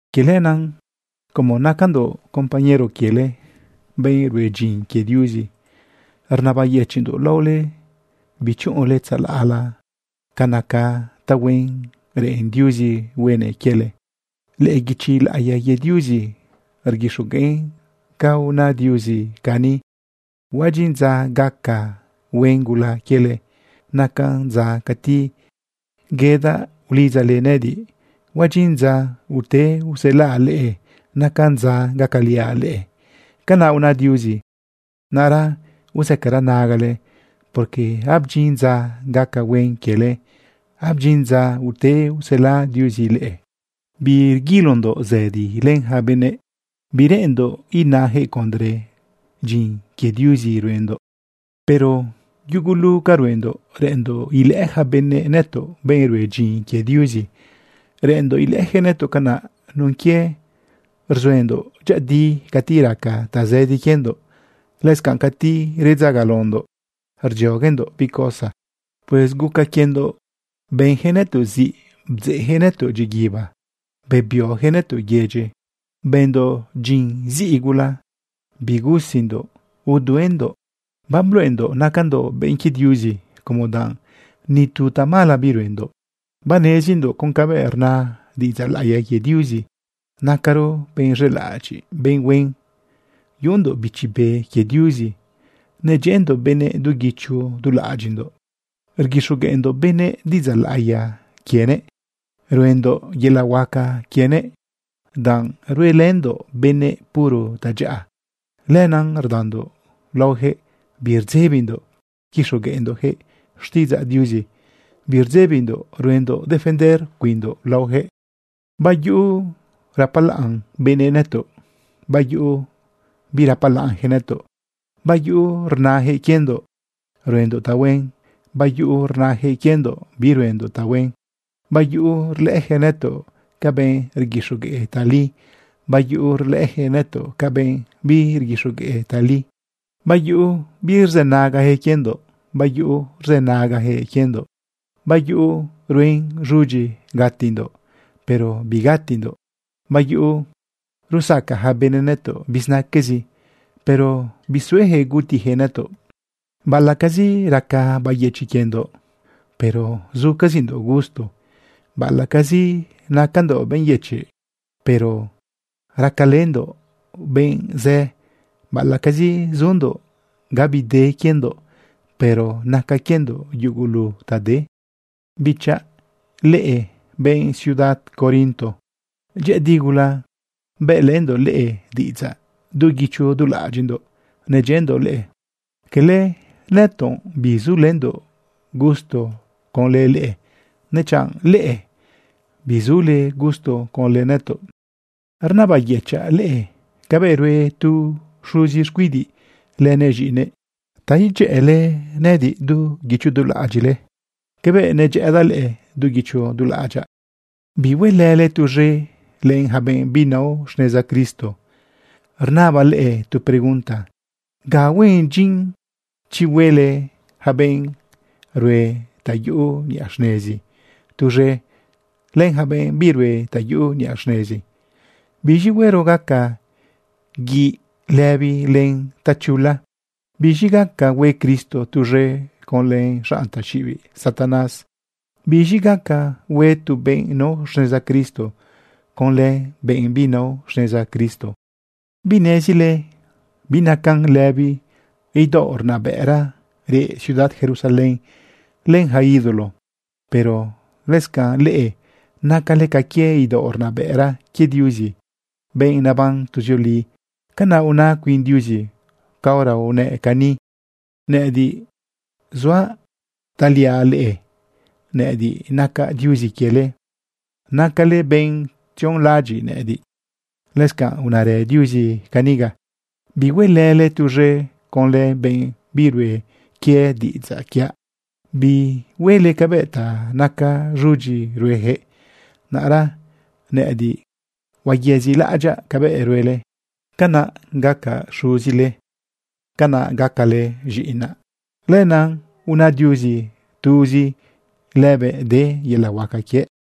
Quie lenaꞌ, como nacandoꞌ compañero quiele, benꞌ rue dyin quie Diuzi, rnabayëchiꞌndoꞌ laole bichuꞌunle tzalaꞌ la ca naca tahuen reꞌen Diuzi huenëꞌ quiele. Lëꞌë guichi laꞌiya quie Diuzi rguixogueꞌn ca una Diuzi cani: Huadyin dza gaca huen gula quiele, nacan dza cati yedaꞌ ulidzale nëꞌëdiꞌ. Huadyin dza ute uselaꞌ leꞌe, nacan dza gacaliaꞌ leꞌe. Canaꞌ una Diuzi. Naꞌra uzëcara nagale porque abdyin dza gaca huen quiele, abdyin dza ute usela Diuzi leꞌe. Birguilondoꞌ zëdi len ja benëꞌ, bireꞌenndoꞌ inajëꞌ condre dyin quie Diuzi ruendoꞌ. Pero yugulu ca ruendoꞌ reꞌenndoꞌ ilëꞌë ja benëꞌ nëtoꞌ benꞌ rue dyin quie Diuzi. Reꞌenndoꞌ ilëꞌëjëꞌ nëtoꞌ canaꞌ nun quie rzuendoꞌ dyëꞌëdi cati raca tazëdi quiendoꞌ, lëscanꞌ cati redzagalaondoꞌ rdzioguendoꞌ bi cosa. Pues guca quiendoꞌ benjëꞌ nëtoꞌ ziꞌ, bdzeꞌjëꞌ nëtoꞌ dyiguiba, bebiojëꞌ nëtoꞌ yedyi, bëndoꞌ dyin ziꞌi gula, bigusindoꞌ, uduendoꞌ. Babluꞌendoꞌ nacandoꞌ benꞌ quie Diuzi como danꞌ ni tu tamala biruendoꞌ. Banezindoꞌ con cabëꞌ rna diꞌidzaꞌ laꞌiya quie Diuzi. Nacaro benꞌ z̃elaꞌadyiꞌ, benꞌ huen, yuꞌundoꞌ Bichi Be quie Diuzi, nedyëꞌëndoꞌ benëꞌ du guicho du laꞌadyiꞌndoꞌ, rguixogueꞌndoꞌ benëꞌ diꞌidzaꞌ laꞌiya quienëꞌ, ruendoꞌ yelaꞌ huaca quienëꞌ. Danꞌ ruelëndoꞌ benëꞌ puro tadyaꞌa, lenaꞌ rdandoꞌ laojëꞌ birdzebindoꞌ quixogueꞌndoꞌjëꞌ xtiꞌidzaꞌ Diuzi, birdzebindoꞌ ruendoꞌ defender cuinndoꞌ laojëꞌ. Bayuꞌu rapalaꞌn benëꞌ nëtoꞌ, bayuꞌu birapalaꞌnjëꞌ nëtoꞌ. Bayuꞌu rnajëꞌ quiendoꞌ ruendoꞌ tahuen, bayuꞌu rnajëꞌ quiendoꞌ biruendoꞌ tahuen. Bayuꞌu rlëꞌëjëꞌ nëtoꞌ ca benꞌ rguixogueꞌ tali, bayuꞌu rlëꞌëjëꞌ nëtoꞌ ca benꞌ birguixogueꞌ tali. Bayuꞌu birzënagajëꞌ quiendoꞌ, bayuꞌu rzënagajëꞌ quiendoꞌ. Bayuꞌu ruen z̃udyi gatindoꞌ, pero bigatindoꞌ. Bayuꞌu rusaca ja benëꞌ nëtoꞌ bizinaquezi, pero bisuejëꞌ gutijëꞌ nëtoꞌ. Baꞌalaꞌcazi raca bayëchiꞌ quiendoꞌ, pero zucazindoꞌ gusto. Baꞌalaꞌcazi nacandoꞌ benꞌ yëchiꞌ, pero gacalëndoꞌ benꞌzë. Baꞌalaꞌcazi zundoꞌ abide quiendoꞌ, pero naca quiendoꞌ yugulu ta de. Bichaꞌ, leꞌe benꞌ ciudad Corinto, dyëꞌëdi gula bëꞌlëndoꞌ leꞌe diꞌidzaꞌ. Du guicho du laꞌadyiꞌndoꞌ nedyëꞌëndoꞌ leꞌe. Cala nëtoꞌ bizundoꞌ gusto conlë leꞌe, dechanꞌ leꞌe bizule gusto conlë nëtoꞌ. Rnabayëchaꞌ leꞌe cabëꞌ rue tu xuzi xcuidiꞌ lënëꞌ z̃iꞌinëꞌ ta idyëꞌële nëꞌëdiꞌ du guicho du laꞌadyiꞌle cabëꞌ nedyëꞌëdaꞌ leꞌe du guicho du laꞌadyaꞌ. Bihuelële tuz̃e len ja benꞌ binao xneza Cristo. Rnabaꞌ leꞌe tu pregunta: ¿Ga huen dyin chi huelë ja benꞌ rue ta yuꞌu niꞌa xnezi tuz̃e len ja benꞌ birue ta yuꞌu niꞌa xnezi? ¿Biz̃i huero gaca guiꞌ lëbi len tachula? ¿Biz̃i gaca hue Cristo tuz̃e conlë xanꞌ taxiꞌibiꞌ Satanás? ¿Biz̃i gaca hue tu benꞌ nao xneza Cristo conlë benꞌ binao xneza Cristo? ¿Binezile binacan lëbi idaoꞌ rnabëꞌra reꞌ ciudad Jerusalén len ja ídolo? Pero lëscanꞌ leꞌe nacale ca quie idaoꞌ rnabëꞌra quie Diuzi, benꞌ neban tuzioli. Canaꞌ una cuin Diuzi caora unëꞌ cani: Nëꞌëdiꞌ suaꞌ taliaꞌ leꞌe. Nëꞌëdiꞌ nacaꞌ Diuzi quiele, nacale benꞌ tzionlaꞌadyiꞌ nëꞌëdiꞌ. Lëscanꞌ unarë Diuzi caniga: Bihuelële tuz̃e conlë benꞌ birue quie diꞌidzaꞌ quiaꞌ. Bihuele cabëꞌ ta naca z̃udyi ruejëꞌ. Naꞌra nëꞌëdiꞌ huayezilaꞌadyaꞌ cabëꞌ ruele. Canaꞌ gacaꞌ Xuzile, canaꞌ gacale z̃iꞌinaꞌ. Lenaꞌ una Diuzi, tuzi lëbëꞌ de yelaꞌ huaca quie.